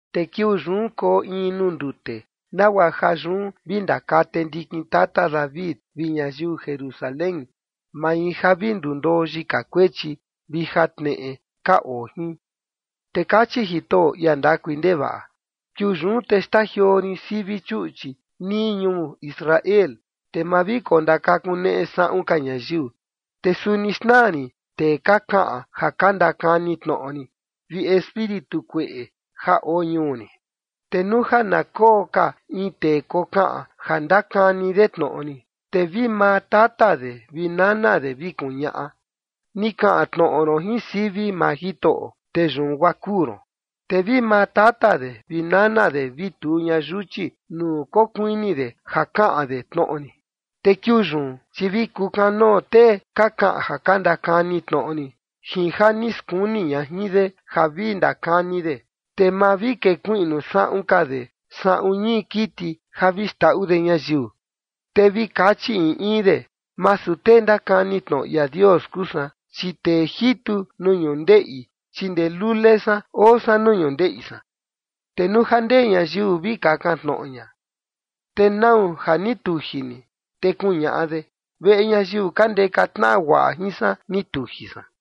’Te kiuu yun koo in nuu ndute nagua ja yun vi ndakate ndikin tata David vi ñayiu Jerusalén, mai ja vi ndundoo yika kuechi vi jatneꞌe ka oo jin. Te kachi Jitoꞌo, ia ndakui ndevaꞌa: Kiuu yun te xtajioo rin sivi chuꞌchi nii ñuu Israel, te ma vi kondakakuneꞌe saꞌun ka ñayiu. Te suni xnaa rin tee ka kaꞌan ja ka ndakani tnoꞌo rin vi espíritu kueꞌe ja oo ñuu rin. ’Te nuu ja na koo ka in tee kokaꞌan ja ndakani de tnoꞌo rin, te vi maa tata de vi nana de vi kuñaꞌa: Ni kaꞌan tnoꞌo ron jin sivi maa Jitoꞌo, te yun guaa kuu ron. Te vi maa tata de vi nana de vi tuu ña yuchi nuu kokuini de ja kaꞌan de tnoꞌo rin. Te kiuu yun, chi vi kukanoo tee ka kaꞌan ja ka ndakani tnoꞌo rin jin ja ni skuni ña jin de ja vi ndakani de, te ma vi kekuiꞌnu saꞌun ka de saꞌun ñii kiti ja vi xndaꞌu de ñayiu. Te vi kachi in in de: Masu tee ndakani tnoꞌo ia Dios kuu san, chi tee jitu nuu ñundeꞌi, chi ndee lule san oo san nuu ñundeꞌi san. Te nuu ja ndee ñayiu vi kakan tnoꞌo ña: ¿Te nau ja ni tuji ni? Te kuñaꞌa de: Veꞌe ñayiu ka ndeka tnaꞌa guaꞌa jin san ni tuji san.”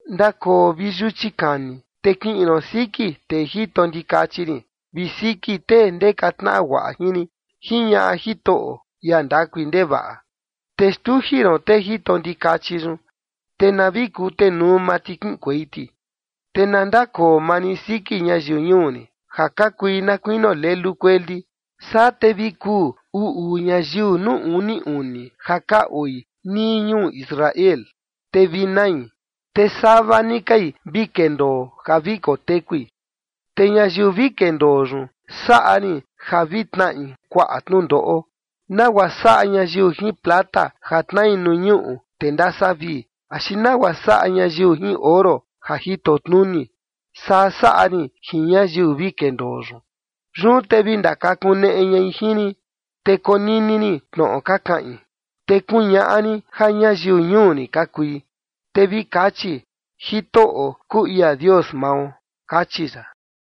Ndakoo vi yuchi kani, te kiꞌin ron siki tee jito ndikachi rin vi siki tee ndeka tnaꞌa guaꞌa jin rin, jiñaꞌa Jitoꞌo, ia ndakui ndevaꞌa. Te xtuji ron tee jito ndikachi yun, te na vi kutenuu maa ti kiꞌinkuei ti. Te na ndakoo maa rin siki ñayiu ñuu rin ja ka kui na kuinio lelu kueli. Saa te vi kuu uu uu ñayiu nuu uni uni ja ka oi nii ñuu Israel, te vi nai, te sava ni kai vi kendoo ja vi kotekui. Te ñayiu vi kendoo yun saꞌa rin ja vi tnaꞌi kuaꞌa tnundoꞌo nagua saꞌa ñayiu jin plata ja tnai nuu ñuꞌu te ndasavii, axi nagua saꞌa ñayiu jin oro ja jito tnuni. Saa saꞌa rin jin ñayiu vi kendoo yun. Yun te vi ndakakuneꞌe ñai jin rin, te konini rin tnoꞌo ka kaꞌin, te kuñaꞌa rin ja ñayiu ñuu rin ka kui, te vi kachi: “Jitoꞌo kuu ia Dios mao”. Kachi ya.